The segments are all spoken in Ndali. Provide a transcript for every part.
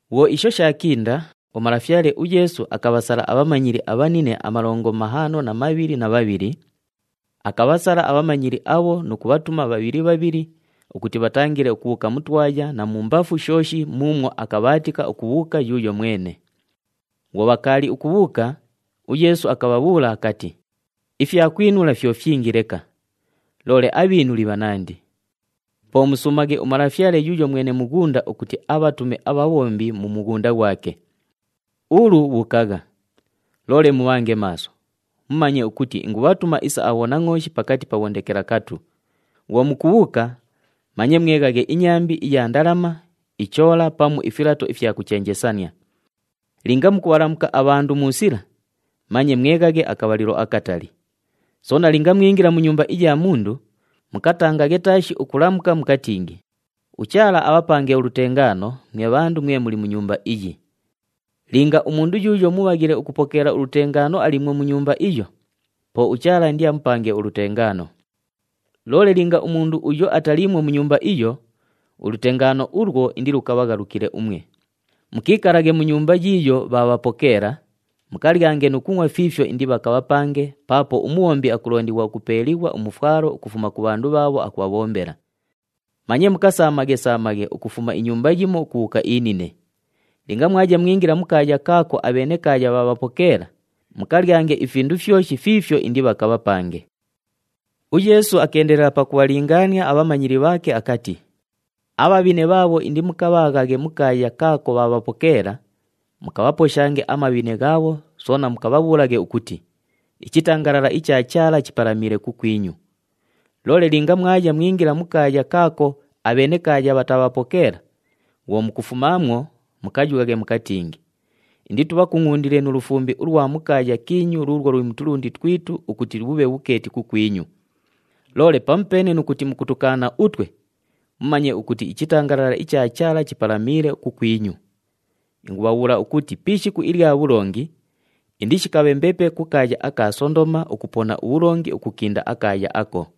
Bhwo isho shaakinda, uMalafyale uYeesu akabhasala abhamanyili abhanine amalongo mahaano na mabhili na bhabhili. Akabhasala abhamanyili abho nu kubhatuma bhabhili bhabhili ukuti bhatangile ukubhuuka mu twaya na mumbafu shooshi muumwo akabhaatika ukubhuuka yuuyo mwene. Bhwo bhakaali ukubhuuka, uYeesu akabhabhuula akati, “Ifyakwinula fyo fyingi leka, loole abhiinuli bhanandi. Po musuumaghe uMalafyale yuuyo mwene mughunda ukuti abhatume abhabhombi mu mughunda ghwake. Ulu bhuukagha. Loole mubhange maaso, mumanye ukuti ingubhatuma isa abhonangʼooshi pakati pa bhondekelakatu! Bhwo mukubhuuka manye mweghaghe inyambi iya ndalama, ichoola pamu ifilato ifya kuchenjesania. Linga mukubhalamuka abhandu mu sila, manye mweghaghe akabhalilo akatali. Soona linga mwingila mu nyumba iya mundu, mukatangaghe taashi ukulamuka mukatingi, ‘UChaala abhapange ulutengaano mwe bhandu mwe muli mu nyumba iyi.’ Linga umundu yuuyo mubhaghile ukupokeela ulutengaano aliimwo mu nyumba iyo, po uChaala indiamupange ulutengaano. Loole linga umundu uyo ataliimwo mu nyumba iyo, ulutengaano ulwo indilukabhaghalukile umwe. Mukiikalaghe mu nyumba yiiyo bhaabhapokeela, mukalyange nu kungʼwa fiifyo indibhakabhapange paapo umubhombi akulondighwa ukupeeliighwa umufwalo ukufuma ku bhandu bhaabho akubhabhombela. Manye mukasaamaghe-saamaghe ukufuma inyumba yimo ukubhuuka inine. Linga mwaya mwingila mu kaaya kaako abhenekaaya bhaabhapokeela, mukalyange ifindu fyoshi fiifyo indibhakabhapange.” UYeesu akeendelela pakubhalingaania abhamanyili bhaake akati, “Abhabhine bhaabho indimukabhaaghaghe mu kaaya kaako bhaabhapokeela, mukabhaposhange amabhine ghaabho soona mukabhabhuulaghe ukuti, ‘Ichitangalala icha Chaala chipalamiile kukwinyu.’ Loole linga mwaya mwingila mu kaaya kaako abhenekaaya bhataabhapokeela, bhwo mukufumaamwo, mukayughaghe mukatingi, ‘Inditubhakungʼundile nu lufumbi ulwa mu kaaya kiinyu luulwo luli mu tulundi twitu ukuti bhubhe bhukeeti kukwinyu. Loole pamupeene nu kuti mukutukaana utwe, mumanye ukuti ichitangalala icha Chaala chipalamiile kukwinyu.’ Ingubhabhuula ukuti pi ishiku ilya bhulongi, indishikabhe mbepe ku kaaya aka Sondoma ukupona ubhulongi ukukinda akaaya ako!”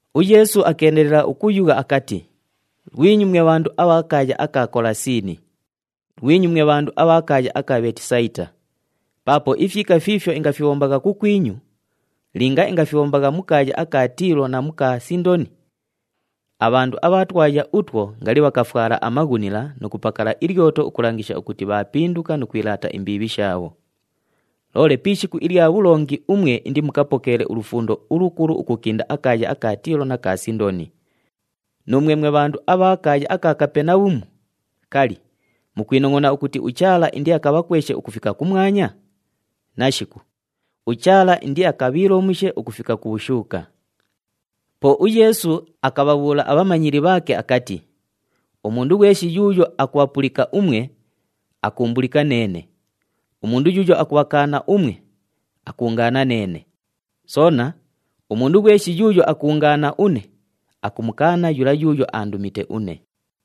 UYeesu akeendelela ukuyugha akati, “Lwinyu mwe bhandu abha kaaya aka Kolasiini! Lwinyu mwe bhandu abha kaaya aka Bheetisayita! Paapo ifyika fiifyo ingafibhombagha kukwinyu, linga ingafibhombagha mu kaaya aka Tiilo na mu ka Sindoni, abhandu abha twaya utwo ngali bhakafwala amaghunila nu kupakala ilyoto ukulangisha ukuti bhaapinduka nu kwilaata imbiibhi shaabho. Loole pi ishiku ilya bhulongi umwe indimukapokeele ulufundo ulukulu ukukinda akaaya aka Tiilo na ka Sindoni. Nuumwe mwe bhandu abha kaaya aka Kapenabhumu, kali, mukwinongʼona ukuti uChaala indiakabhakweshe ukufika kumwanya? Nashiku! UChaala indiakabhiilomushe ukufika ku bhushuuka.” Po uYeesu akabhabhuula abhamanyili bhaake akati, “Umundu ghweshi yuuyo akubhapulika umwe, akuumbulika neene. Umundu yuuyo akubhakaana umwe, akuungaana neene. Soona, umundu ghweshi yuuyo akuungaana une, akumukaana yula yuuyo aandumite une.”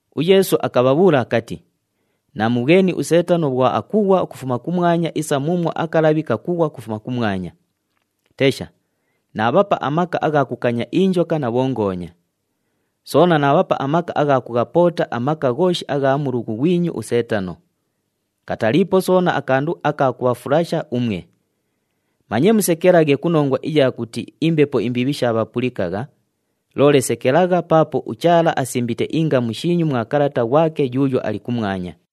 UYeesu akabhabhuula akati, “Naamubhweni uSeetano bhwo akughwa ukufuma kumwanya isa muumwo akalabhi kakughwa ukufuma kumwanya. Tesha, naabhapa amaka agha kukanya injoka na bhongoonya. Soona naabhapa amaka agha kughapoota amaka ghooshi agha mulughu ghwinyu uSeetano. Kataliipo soona akandu aka kubhafulasha umwe. Manye musekelaghe ku nongwa iya kuti imbepo imbiibhi shaabhapulikagha, loole sekelagha paapo uChaala asimbite ingamu shiinyu mwa kalata ghwake yuuyo ali kumwanya.”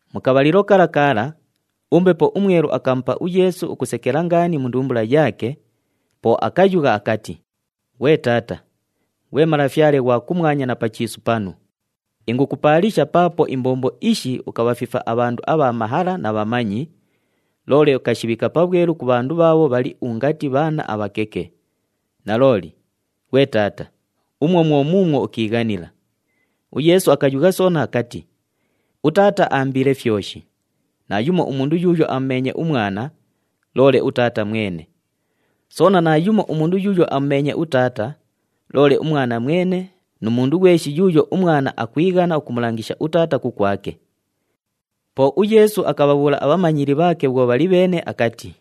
Mu kabhalilo kala kala, uMbepo uMwelu akamupa uYeesu ukusekela ngaani mu ndumbula yaake, po akayugha akati, “Ghwe Taata, ghwe Malafyale ghwa kumwanya na pa chiisu panu, ingukupaalisha paapo imbombo ishi ukabhafifa abhandu abha mahala na bhamanyi, loole ukashibhiika pabhwelu ku bhandu bhaabho bhali ungati bhaana abhakeke. Nalooli, ghwe Taata, umwo mwo muumwo ukiighanila.” UYeesu akayugha soona akati, “UTaata aambiile fyoshi. Naayumo umundu yuuyo amumeenye uMwana, loole uTaata mwene. Soona naayumo umundu yuuyo amumeenye uTaata, loole uMwana mwene nu mundu ghweshi yuuyo uMwana akwighana ukumulangisha uTaata kukwake.” Po uYeesu akabhabhuula abhamanyili bhaake bhwo bhali bheene akati,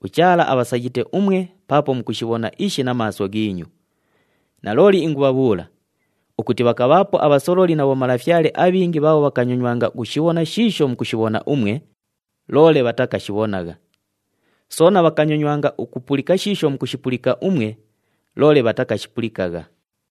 “UChaala abhasayite umwe paapo mukushibhona ishi na maaso ghiinyu. Nalooli ingubhabhuula ukuti bhakabhaapo abhasololi na bhomalafyale abhingi bhaabho bhakanyonywanga ukushibhona shiisho mukushibhona umwe, loole bhatakashibhonagha. Soona bhakanyonywanga ukupulika shiisho mukushipulika umwe, loole bhatakashipulikagha.”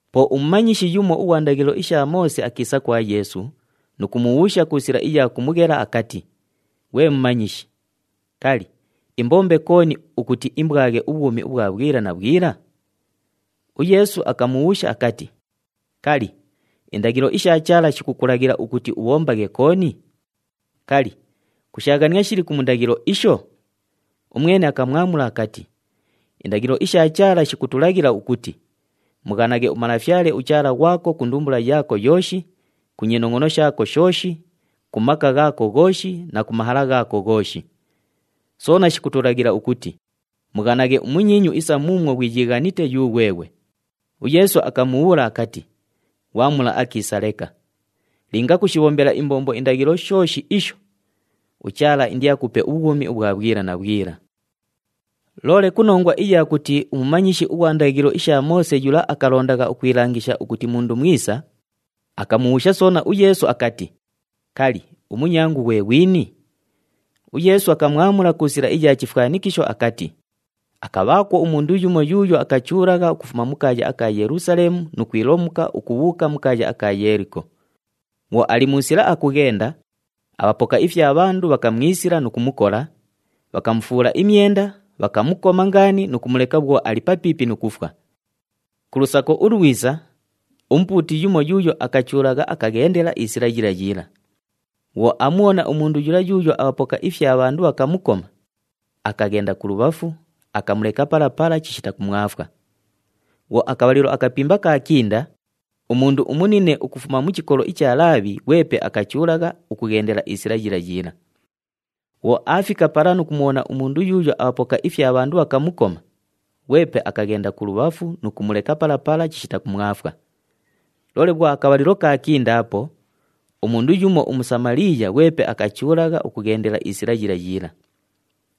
Po umumanyishi yumo ughwa ndaghilo isha Moose akiisa kwa Yeesu nu kumubhuusha ku sila iya kumughela akati, “Ghwe Mumanyishi, kali, imbombe kooni ukuti imbwaghe ubhwumi ubhwa bhwila na bhwila?” UYeesu akamubhuusha akati, “Kali, indaghilo isha Chaala shikukulaghila ukuti ubhombaghe kooni? Kali, kushaaghania shiliku mu ndaghilo isho?” Umwene akamwamula akati, “Indaghilo isha Chaala shikutulaghila ukuti, ‘Mughanaghe uMalafyale uChaala ghwako ku ndumbula yaako yooshi, ku nyinongʼono shaako shooshi, ku maka ghaako ghooshi na ku mahala ghaako ghooshi.’ Soona shikutulaghila ukuti, ‘Mughanaghe umunyiinyu isa muumwo ghwiyiighanite yughweghwe.’” UYeesu akamubhuula akati, “Ghwamula akiisa leka! Linga kushibhombela imbombo indaghilo shooshi isho, uChaala indiakupe ubhwumi ubhwa bhwila na bhwila.” Loole ku nongwa iya kuti umumanyishi ughwa ndaghilo isha Moose yula akalondagha ukwilangisha ukuti mundu mwisa, akamubhuusha soona uYeesu akati, “Kali, umunyangu ghwe ghwini?” UYeesu akamwamula ku sila iya chifwanikisho akati, “Akabhaakwo umundu yumo yuuyo akachuulagha ukufuma mu kaaya aka Yelusaleemu nu kwilomuka ukubhuuka mu kaaya aka Yeeliko. Bhwo ali mu sila akughenda, abhapoka ifya bhandu bhakamwisila nu kumukola, bhakamufuula imyenda, bhakamukoma ngaani nu kumuleka bhwo ali papiipi nu kufwa. Ku lusako ulwisa, umupuuti yumo yuuyo akachuulagha, akaghendela isila yila yila. Bhwo aamubhona umundu yula yuuyo abhapoka ifya bhandu bhakamukoma, akaghenda kulubhafu, akamuleka pala pala chishita kumwafwa. Bhwo akabhalilo akapimba kaakinda, umundu umunine ukufuma mu chikolo icha Laabhi ghwepe akachuulagha ukughendela isila yila yila. Bhwo aafika pala nu kumubhona umundu yuuyo abhapoka ifya bhandu bhakamukoma, ghwepe akaghenda kulubhafu nu kumuleka pala pala chishita kumwafwa. Loole bhwo akabhalilo kaakindaapo, umundu yumo uMusamaliiya ghwepe akachuulagha ukughendela isila yila yila.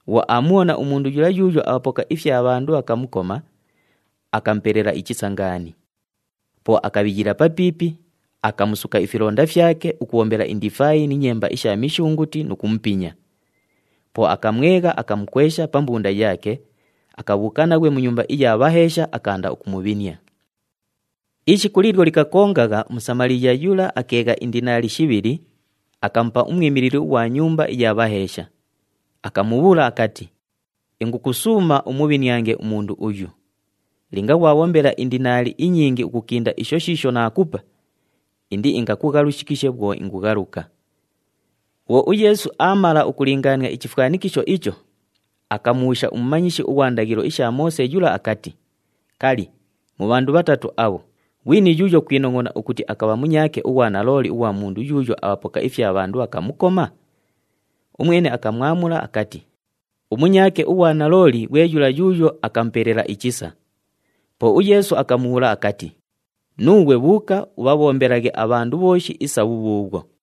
Bhwo aamubhona umundu yula yuuyo abhapoka ifya bhandu bhakamukoma, akamupelela ichisa ngaani. Po akabhiyila papiipi, akamusuka ifilonda fyake ukubhombela indifaayi ni nyemba isha mishunguti nu kumupinya. Po akamwegha, akamukwesha pa mbunda yaake, akabhuuka naghwe mu nyumba iya bhaheesha, akaanda ukumubhinia. “Ishiku liilyo likakongagha uMusamaliiya yula akeegha indinaali shibhili, akamupa umwimilili ughwa nyumba iya bhaheesha, akamubhuula akati, ‘Ingukusuuma umubhiniange umundu uyu. Linga ghwabhombela indinaali inyingi ukukinda isho shiisho naakupa, indiingakughalushikishe bhwo ingughaluka.’” Bhwo uYeesu aamala ukulingaania ichifwanikisho icho, akamubhuusha umumanyishi ughwa ndaghilo isha Moose yula akati, “Kali, mu bhandu bhatatu abho, ghwini yuuyo kwinongʼona ukuti akabha munyaake ughwa nalooli ughwa mundu yuuyo abhapoka ifya bhandu bhakamukoma?” Umwene akamwamula akati, “Umunyaake ughwa nalooli ghwe yula yuuyo akamupelela ichisa.” Po uYeesu akamubhuula akati, “Nuughwe bhuuka ubhabhombelaghe abhandu bhooshi isa bhubhuubhwo.”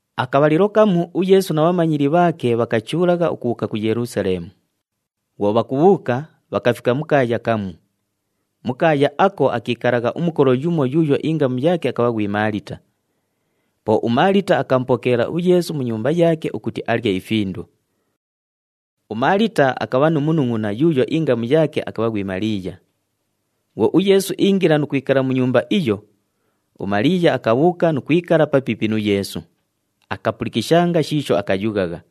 Akabhalilo kamu uYeesu na bhamanyili bhaake bhakachuulagha ukubhuuka ku Yelusaleemu. Bhwo bhakubhuuka, bhakafika mu kaaya kamu. Mu kaaya ako akiikalagha umukolo yumo yuuyo ingamu yaake akabha ghwi Maalita. Po uMaalita akamupokeela uYeesu mu nyumba yaake ukuti alye ifindu. UMaalita akabha nu munungʼuna yuuyo ingamu yaake akabha ghwi Maliiya. Bhwo uYeesu iingila nu kwikala mu nyumba iyo, uMaliiya akabhuuka nu kwikala papiipi nu Yeesu, akapulikishanga shiisho akayughagha.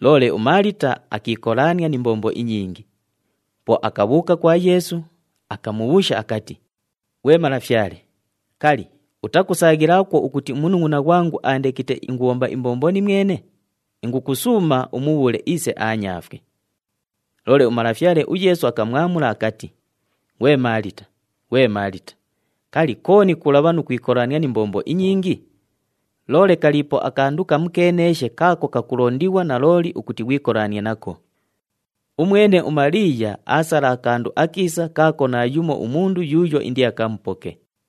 Loole uMaalita akiikolaania ni mbombo inyingi. Po akabhuuka kwa Yeesu, akamubhuusha akati, “Ghwe Malafyale, kali, utakusaaghilaakwo ukuti umunungʼuna ghwangu aandekite ingubhomba imbombo nimwene? Ingukusuuma umubhuule iise aanyaafwe.” Loole uMalafyale uYeesu akamwamula akati, “Ghwe Maalita, ghwe Maalita, kali, kooni kulabha nu kwikolaania ni mbombo inyingi? Loole kaliipo akandu kamukeeneeshe kaako kakulondighwa nalooli ukuti ghwikolanie nako. Umwene uMaliiya aasala akandu akiisa kaako naayumo umundu yuuyo indiakamupoke.”